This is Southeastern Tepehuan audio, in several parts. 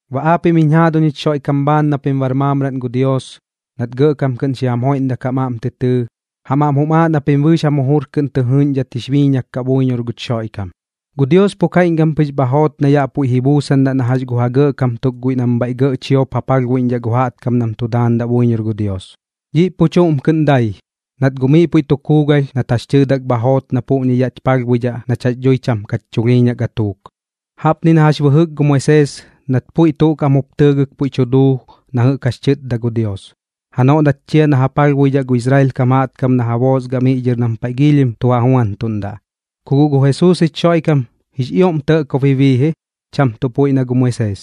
Baꞌ aapiꞌm jiñ jaaduñ jich Xoiꞌkam bhaan na pim bar maamraꞌn gu Dios, nat gɇꞌkam kɨꞌn xi jam joiꞌndak jam aꞌm tɨ tɨɨ, jam aꞌm jum aaꞌ na pim bɨɨx jam jujur kɨꞌn tɨ jɨɨꞌñdhat jix biiñak kaꞌ buiñor guch Xoiꞌkam. Gu Dios pu kaiꞌñkam pɨx bha joot na yaꞌ puiꞌ ba ji buusandaꞌ na jax gu ja gɇꞌkam tuk guiꞌ nam bhaiꞌ gɇꞌ chiop ja palhbuiꞌñdhaꞌ gu jaꞌtkam nam tu daandaꞌ buiñor gu Dios. Dhiꞌ pu chuꞌm kɨꞌn dai, nat guꞌ miꞌ puiꞌ tu kuugalh nat jax tɨɨdak bha joot na puꞌñi yaꞌch palhbuidhaꞌ nach jax dhui cham kach chulhiiñaꞌ gatuuk. Jaꞌpni na jax bɨjɨk gu Moisees nat puiꞌ tuꞌ kaꞌm jup tɨɨgɨk puiꞌ tu duu na jɨꞌk jax tɨtda gu Dios, janoꞌ nat chia na ja palhbuidhaꞌ gu Israel kam jaꞌtkam na ja boosgaꞌ miꞌ dhɨr nam paiꞌ giilhim tu ja juantuꞌndaꞌ. Ku guꞌ gu Jesuus jich Xoiꞌkam jix ioꞌm tɇꞌkob ji bii ji, cham tuꞌ puiꞌ na gu Moisees,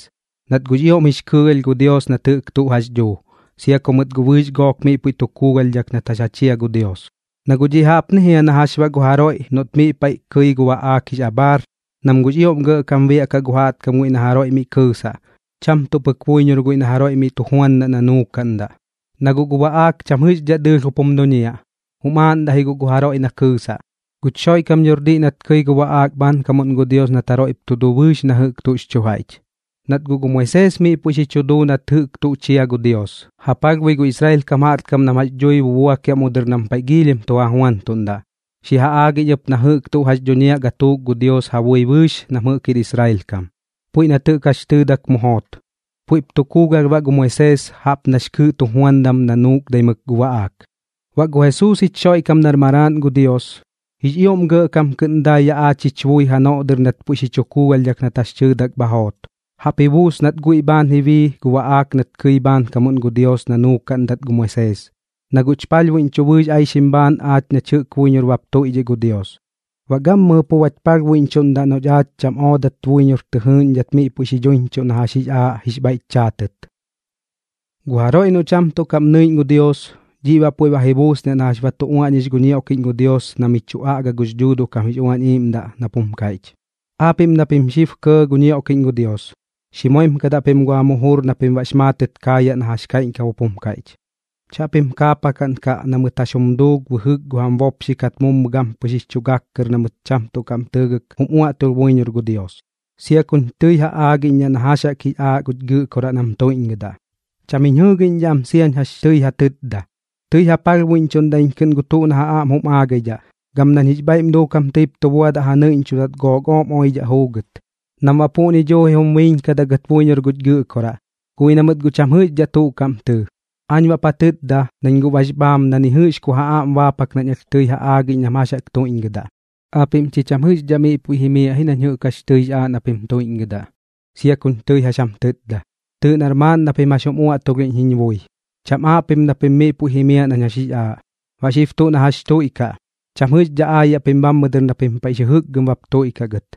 nat guꞌx ioꞌm jix kɨɨgalh gu Dios nat jɨꞌk tuꞌ jax dhuu, sia ku mɨt guꞌ bɨɨx gook miꞌ puiꞌ tu kuugalhdhak nat jax ja chia gu Dios. Na guꞌ dhiꞌ jaꞌpni jia na jax baꞌ gu jaroiꞌ noꞌt miꞌ paiꞌ kɨi gu baꞌaak jix abhaar, nam guꞌx ioꞌm gɇꞌkam biaꞌkaꞌ gu jaꞌtkam guiꞌ na jaroiꞌ miꞌ kɨɨsaꞌ, cham tuꞌ pɨk buiñor guiꞌ na miꞌ tu juandaꞌ na nuukaꞌndaꞌ. Na guꞌ gu baꞌaak cham jɨꞌxdhaꞌ dɨɨlh jup jum duñiaꞌ, jum aaꞌndaꞌ ji gu jaroiꞌ na kɨɨsaꞌ. Guch Xoiꞌkam dhor diꞌ nat kɨi guiꞌ gu baꞌaak bhaankamuꞌn gu Dios nat jaroiꞌp tu duu bɨɨx na jɨꞌk tuꞌx chu jaiꞌch. Nat guꞌ gu Moisees miꞌ puiꞌ xi chu duu nat jɨꞌk tuꞌ chia gu Dios, ja palhbui gu Israel kam jaꞌtkam nam jax dhui bubuakiaꞌ mu dɨr nam paiꞌ giilhim tu ja juantuꞌndaꞌ. Xi ja aagiꞌñ ɨp na jɨꞌk tuꞌ jax dhuñiaꞌ gatuuk gu Dios ja bui bɨɨx nam jɨꞌk jir Israel kam, puiꞌ nat jɨꞌk jax tɨɨdak mu joot. Puiꞌp tu kuugalh baꞌ gu Moisees jaꞌp nax kɨɨꞌ tujuandam na nuukdaimɨk gu baꞌaak. Baꞌ gu Jesuus jich Xoiꞌkam nar Maraaꞌn gu Dios, jix ioꞌm gɇꞌkam kɨꞌn dai yaꞌ aach jich bui janoꞌ dɨr nat puiꞌ xi chu kuugalhdhak nat jax tɨɨdak bha joot. Jaꞌp ji buus nat guiꞌ bhaan ji bii gu baꞌaak nat kɨi bhaankamuꞌn gu Dios na nuukaꞌndat gu Moisees, na guꞌch palhbuiꞌñchuꞌ bɨɨx aixim bhaan aach nach jɨꞌk buiñor bap tuiꞌdhiꞌ gu Dios. Baꞌ gammɨjɨ pu bach palhbuiꞌñchuꞌndaꞌ noꞌch aach cham oodat buiñor tɨ jɨɨꞌñdhat miꞌ puiꞌ xi dhuiñchuꞌ na jax jix aaꞌ jix bhaiꞌch chaatɨt. Gu jaroiꞌ noꞌ cham tuꞌ kaꞌm nɨiꞌñ gu Dios, dhiꞌ baꞌ puiꞌ ba ji buusniaꞌ na jax ba tu uaꞌñix gu ñioꞌkiꞌñ gu Dios na mi chu aꞌga gux Dhuuduꞌ kam jix Uañ Iiꞌmdaꞌ nap jum kaiꞌch: Aapiꞌm na pim xib kɇɇ gu ñioꞌkiꞌñ gu Dios, xi moimkadaꞌ pim gu jam jujur na pim baꞌx maatɨt kaayaꞌ na jax kaiꞌñkam jup jum kaiꞌch. Chaꞌpim kaapakaꞌnkaꞌ na mɨt jax jum duu bɨjɨk gu jam bopxikat mummu gampɨx jix chu gak kɨr na mɨt cham tuꞌ kaꞌm tɨɨgɨk jum uaꞌtulh buiñor gu Dios, sia kuñ tɨi ja aagiꞌñdhaꞌ na jax jaꞌk jix aaꞌ guch Gɨꞌkoraꞌ nam tuiꞌñgɨdaꞌ. Cham jiñ jɨɨgiꞌñdhaꞌ am siañ jax tɨi ja tɨtda. Tɨi ja palhbuiꞌñchuꞌndaꞌ iñ kɨꞌn gu tuꞌ na ja aꞌm jum aagaidhaꞌ, gam nañ jix bhaiꞌm duukam tɨip tu buadaꞌ ja nɨiꞌñchudat gook ooꞌm oidhaꞌ juugɨt, nam baꞌ puꞌñi duuji jum biiñkadaꞌ gɨt buiñor guch Gɨꞌkoraꞌ. Guꞌ ji na mɨt guꞌ cham jɨꞌxdhaꞌ tuꞌ kaꞌm tɨɨ. Aañ baꞌp ja tɨtda, nañ guꞌ bax bhaam na ni jɨꞌx ku ja aꞌm baapak nañ alh tɨi ja aagiꞌñ nam jax jaꞌk tuiꞌñgɨdaꞌ: “Aapiꞌm chi cham jɨꞌxdhaꞌ miꞌ puiꞌ jimiaꞌ ji nañ jɨꞌk jax tɨix aaꞌ na pim tuiꞌñgɨdaꞌ, sia kuñ tɨi jax jam tɨtda. Tɨɨꞌ nar maaꞌn na pim jax jum uaꞌtulhiꞌñ jiñ bui, cham aaꞌ pim na pim miꞌ puiꞌ jimiaꞌ nañ jax jix aaꞌ. Baꞌ xib tuꞌ na jax tuiꞌkaꞌ, cham jɨꞌxdhaꞌ aayaꞌ pim bhammɨ dɨr na pim paiꞌx jɨjɨkgɨm bap tuiꞌkaꞌ gɨt.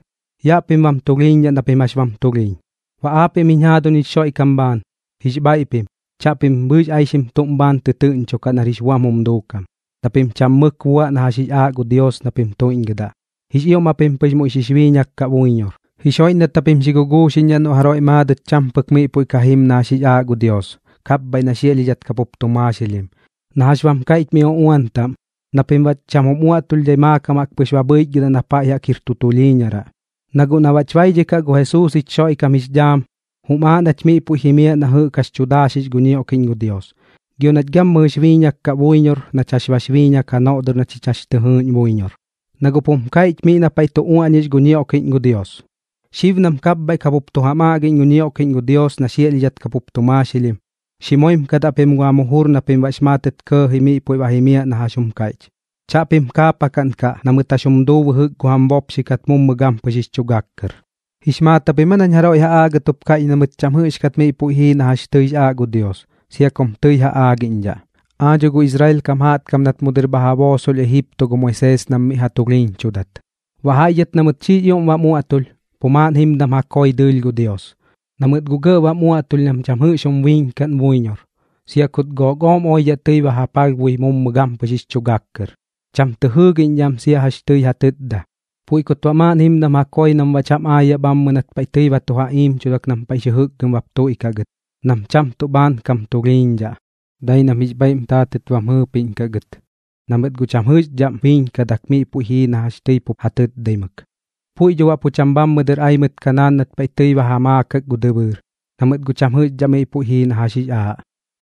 Yaꞌ pim pu bam tulhiiñdhaꞌ na pim jax bam tulhiiñ.” Baꞌ aapiꞌm jiñ jaaduñ jich Xoiꞌkam bhaan, jix bhaiꞌ pim, chaꞌpim bɨɨx aixim tuꞌm bhaan tɨtɨɨꞌñchokaꞌ nar jix buam jum duukam, na pim cham mɨk buaꞌ na jax jix aaꞌ gu Dios na pim tuiꞌñgɨdaꞌ. Jix ioꞌm japim pɨx muiꞌ xix biiñak kaꞌ buiñor. Jix joiꞌndat japim xi guguuxiꞌñdhaꞌ noꞌ jaroiꞌ maadɨt cham pɨk miꞌ puiꞌ ka jim na jax jix aaꞌ gu Dios, kapbhaiꞌ na xiaꞌlhidhat kapup tu maaxilhim, na jax bam kaiꞌch mi uꞌuan taꞌm, na pim baꞌ cham jum uaꞌtulhdhai maakam jaꞌk pɨx ba bhɨichgɨdaꞌ na paiꞌ jaꞌk jir tu tulhiiñaraꞌ. Na guꞌ na baꞌch baidhikaꞌ gu Jesuus jich Xoiꞌkam jix dhaam jaꞌk, jum aaꞌ nach miꞌ puiꞌ jimiaꞌ na jɨꞌk jax tu daaxix gu ñioꞌkiꞌñ gu Dios, gio nach gammɨjɨx biiñak kaꞌ buiñor nach jax bax biiñak janoꞌ dɨr na chich jax tɨ jɨɨꞌñ buiñor. Na guꞌp jum kaiꞌch miꞌ na paiꞌ tu uaꞌñix gu ñioꞌkiꞌñ gu Dios: Xib nam kapbhaiꞌ kapup tu jam aꞌgiꞌñ gu ñioꞌkiꞌñ gu Dios na xiaꞌlhidhat kapup tu maaxilhim, xi moimkadaꞌ pim gu jam jujur na pim baꞌx maatɨt kɇɇji miꞌ puiꞌ ba jimiaꞌ na jax jum kaiꞌch. Chaꞌpim kaapakaꞌnkaꞌ na mɨt jax jum duu bɨjɨk gu jam bopxikat mummu gampɨx jix chu gak kɨr. ¿Jix maat japim aa nañ jaroiꞌ ja aagɨt jup kaiꞌch na mɨt cham jɨꞌxkat miꞌ puiꞌ jii na jax tɨix aaꞌ gu Dios, sia kum tɨi ja aagiꞌñdhaꞌ? Aa dho gu Israel kam jaꞌtkam nat mu dɨr bha ja boosolh Ejipto gu Moisees nam miꞌ ja tulhiiñchudat. Baꞌ jaiꞌ dhɨt na mɨt xiꞌx ioꞌm bam uaꞌtulh, pu maaꞌn jimdam ja koi dɨɨlh gu Dios, na mɨt guꞌ gɇꞌ bam uaꞌtulh nam cham jɨꞌx jum biiñkaꞌn buiñor, sia kut gook ooꞌm oidhaꞌ tɨi ba ja palhbui mummu gampɨx jix chu gak kɨr. Cham tɨ jɨɨgiꞌñdhaꞌ am sia jax tɨi ja tɨtda. Puiꞌ kut baꞌ maaꞌn jimdam ja koi nam baꞌ cham aayaꞌ bhammɨ nat paiꞌ tɨi ba tu ja iimchudak nam paiꞌx jɨjɨkgɨm bap tuiꞌkaꞌ gɨt, nam cham tuꞌ bhaan kam tulhiiñdhaꞌ, dai nam jix bhaiꞌm taatɨt bam jɨɨpiꞌñkaꞌ gɨt, na mɨt guꞌ cham jɨꞌxdhaꞌm biiñkadak miꞌ puiꞌ jii na jax tɨi pup ja tɨtdaimɨk. Puiꞌ dho baꞌ pu cham bhammɨ dɨr ai mɨt Kanaan nat paiꞌ tɨi ba ja maakak gu dɨbɨɨr, na mɨt guꞌ cham jɨꞌxdhaꞌ miꞌ puiꞌ jii na jax jix aaꞌ.